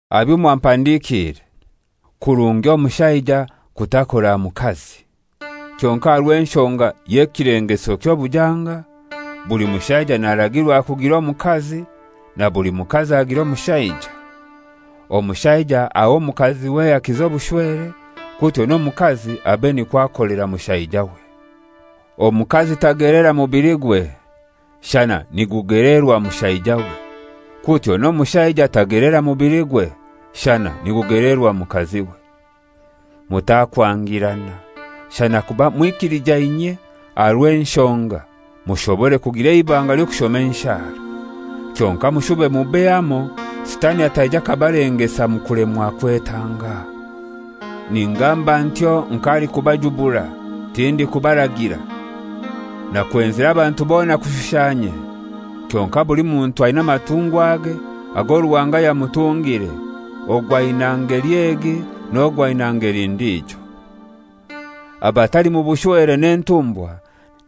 Aha byo mwampandikiire: Kirungi omushaija kutakora aha mukazi. Kyonkai aha rw'enshonga y'ekilengeso ky'obujanga, buli mushaija naragirwa kugira omukazi, na buli mukazi agire omushaija. Omushaija ahe omukaziwe ehaki z'obushwere, kutyo n'omukazi abe nikwo akolera mushaijawe. Omukazi tageleera mubiligwe, shana nigugeleerwa mushaijawe. Kutyo n'omushaija tagelera mubiligwe, shana nigugelerwa mukaziwe. Mutakwangirana, shana kuba mwikilijainyie aha rw'enshonga, mushobore kugira eibanga ly'okushoma enshara. Kyonkai mushube mube hamoi, Sitani ataija akabalengesa omu kulemwa kwetanga. Ningamba ntyo nk'alikubajubura, tindikubaragira. Nakwenzire abantu bona kushusha inye. Kyonkai buli muntu aina amatungwa age ago Ruhanga yamutungire, ogu aina ngeli egi n'ogu aina ngeli ndijo. Abatali mu bushwere n'entumbwa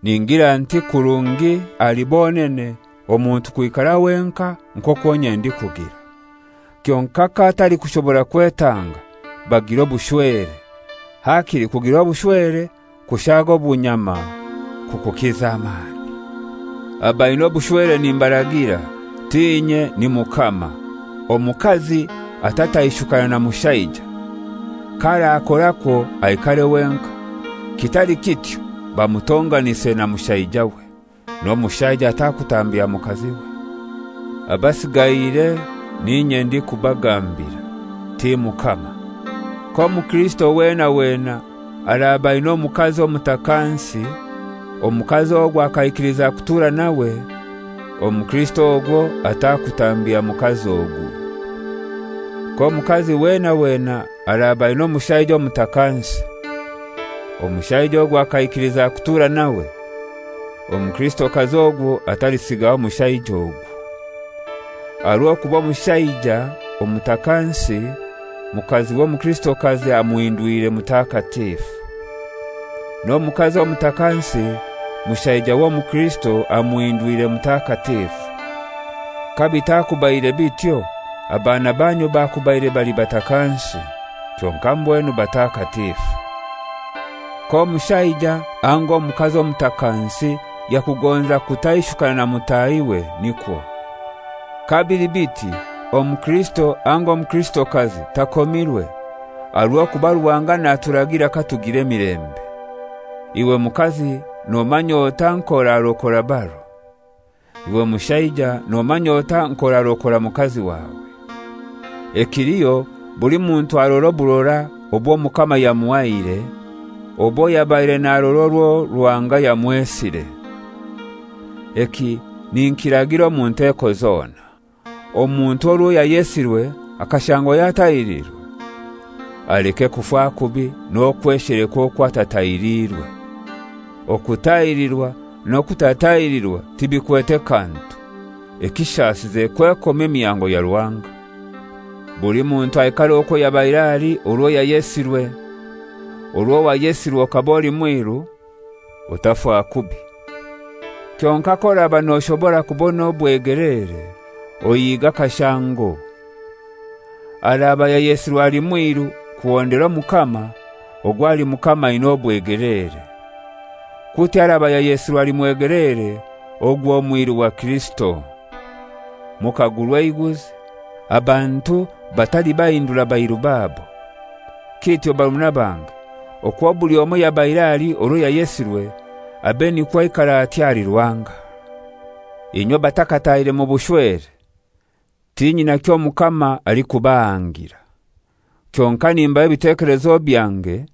ningira nti kirungi ahali bonene omuntu kwikara wenkai nk'okwo inye ndikugira. Kyonkai kabatalikushobora kwetanga, bagire obushwere. Hakili kugira obushwere kushaaga obunyama kukukiza amani. Abaina obushwere nimbaragira: T'inye, ni Mukama, omukazi atataishukana na mushaija. (K'arakorakwo, aikare wenkai; kitali kityo bamutonganise na mushaijawe). N'omushaija atakutambya mukaziwe. Abasigaire n'inye ndikubagambira, ti Mukama: k'omukirisito wena wena araaba aina omukazi omutakansi, omukazi ogwo akaikiliza kutura nawe, omukirisito ogwo atakitambya mukazi ogu. K'omukazi wena wena araaba aina omushaija omutakansi, omushaija ogwo akaikiliza kutura nawe, omukirisitokazi ogwo atalisigaho mushaija ogu. Aha rw'okuba omushaija omutakansi, mukaziwe omukirisitokazi amuhindwire mutakatifu. N'omukazi omutakansi, mushaijawe omukrisito amuhindwire mutakatifu. Kabitakubaire bityo abaana banyu bakubaire bali batakansi, kyonkai mbwenu batakatifu. K'omushaija anga omukazi omutakansi yakugonza kutaishukana na mutahiwe, nikwo. Kabili biti omukirisito anga omukrisitokazi takomirwe. Aha rw'okuba Ruhanga naturagira katugira emilembe. Iwe mukazi nomanya otai nk'orarokora baro? Iwe mushaija nomanya otai nk'orarokora mukazi wawe? Ekiliho buli muntu arore oburora obw'Omukama yamuhaire, obwo yabaire narora orwo Ruhanga yamwesire. Eki ninkiragira omu nteko zona. Omuntu orwo yayesirwe akashangwa yatahiriirwe? Aleke kufa kubi n'okwesheleka okwo atatahirirwe. Okutahirirwa n'okutatahirirwa tibikwete kantu, ekishasize kwekomya emihango ya Ruhanga. Buli muntu aikare okwo yabaire ali orwo yayesirwe. Orwo wayesirwe okaba oli mwiru? Otafa kubi. Kyonkai k'oraba noshobora kubona obwegeleere, ohiige akashango. Araba yayesirwe ali mwiru kuhondera Omukama, ogwo ahali Mukama aina obwegeleere. Kutyo araba yayesirwe ali mwegeleere ogwo mwiru wa Kirisito. Mukagurwa eiguzi. Abantu batalibahindura bairu babo. Kityo barumuna bange, okwo buli omoi yabaire ali orwo yayesirwe, abe nikwo aikara atyo ahali Ruhanga. Inywe abatakataahire mu bushwere, tinyina kyo Mukama alikubahangira. Kyonkai nimbaha ebitekelezo byange,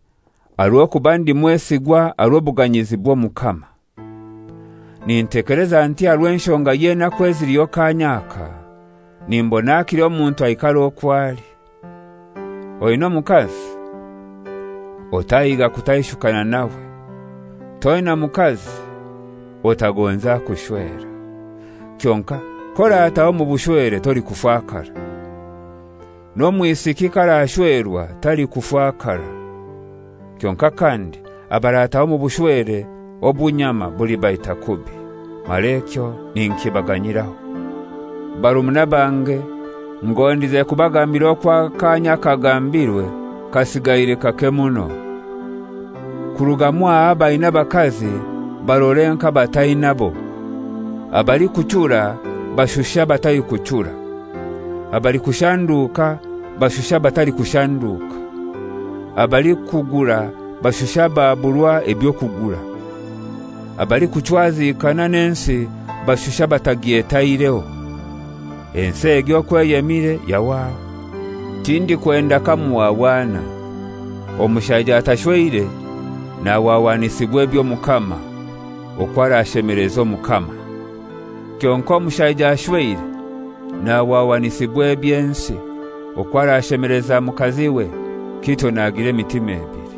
aha rw'okuba ndi mwesigwa aha rw'obuganyizi bw'Omukama. Nintekeleza nti aha rw'enshonga y'enaku eziliho kaanya aka, nimbona hakili omuntu aikare okwo ali. Oina omukazi? Otahiga kutaishukana nawe. Toina mukazi? Otagonza kushwera. Kyonkai k'orataaha omu bushwere tolikufakara. N'omwisiki k'arashwerwa talikufakara. Kyonkai kandi abarataaha omu bushwere obunyama bulibaita kubi, mara ekyo ninkibaganyiraho. Barumuna bange, ngondize kubagambira okwo akaanya akagambirwe kasigaire kake muno. Kuruga mwaha abaina abakazi barore nk'abatainabo. Abalikuchura bashushe abatalikuchura; abalikushanduuka bashushe abatalikushanduuka; abalikugura bashushe ababurwa eby'okugura; abalikuchwazikana n'ensi bashushe abatagyetaireho. Ensi egi okwo eyemire yahwaho. Tindikwenda kamuhwahwana. Omushaija atashweire nahwahwanisibwa eby'Omukama, okwo arashemeleza Omukama. Kyonkai omushaija ashweire nahwahwanisibwa eby'ensi, okwo arashemeleza mukaziwe, kityo nagira emitima ebili.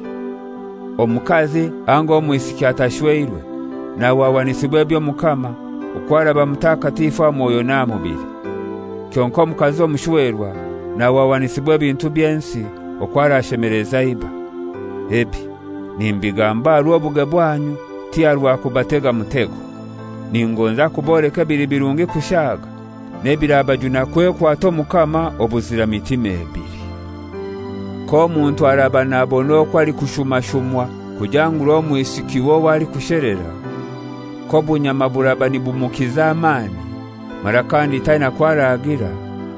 Omukazi anga omwisiki atashweirwe nahwahwanisibwa eby'Omukama, okwo araba mutakatifu aha mwoyo n'aha mubili. Kyonkai omukazi omushwerwa nahwahwanisibwa ebintu by'ensi, okwo arashemeleza iba. Ebi nimbigamba aha rw'obuge bwanyu, ti aha rwa kubatega mutego. Ningonza kuboleka ebili birungi kushaaga, n'ebirabajuna kwekwata Omukama obuzira mitima ebili. K'omuntu araba nabona okwo alikushumashumwa kujangura omwisikiwe owo alikushelera, k'obunyama buraba nibumukiza amani, mara kandi taina kwo aragira,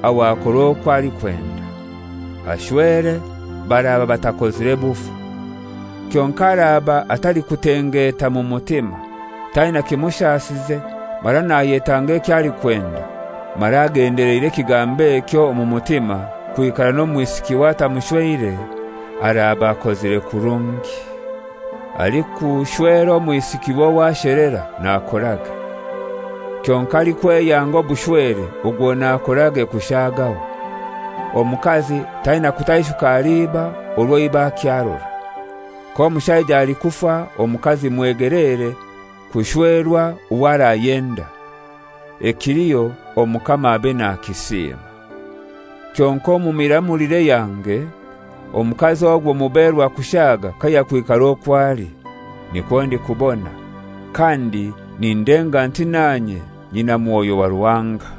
aho akore okwo alikwenda: Ashwere, baraba batakozire bufu. Kyonkai araaba atalikutengeta mu mutima, taina kimushasize mara nayetanga ekyo alikwenda, mara agendeleire ekigambo ekyo omu mutima, kwikara n'omwisikiwe atamushweire, araaba akozire kurungi. Alikushwera omwisikiwe owo ashelera nakorage; kyonkai alikweyanga obushwere ogwo nakorage kushaagaho. Omukazi taina kutaishuka ahali iba orwo iba akyarora. K'omushaija alikufa, omukazi mwegeleere kushwerwa owo arayenda, ekiliho Omukama abe nakisiima. Kyonkai omu miramulire yange, omukazi ogwo muberwa kushaaga kayakwikara okwo ali. Nikwo ndikubona, kandi nindenga nti nanye nyina mwoyo wa Ruhanga.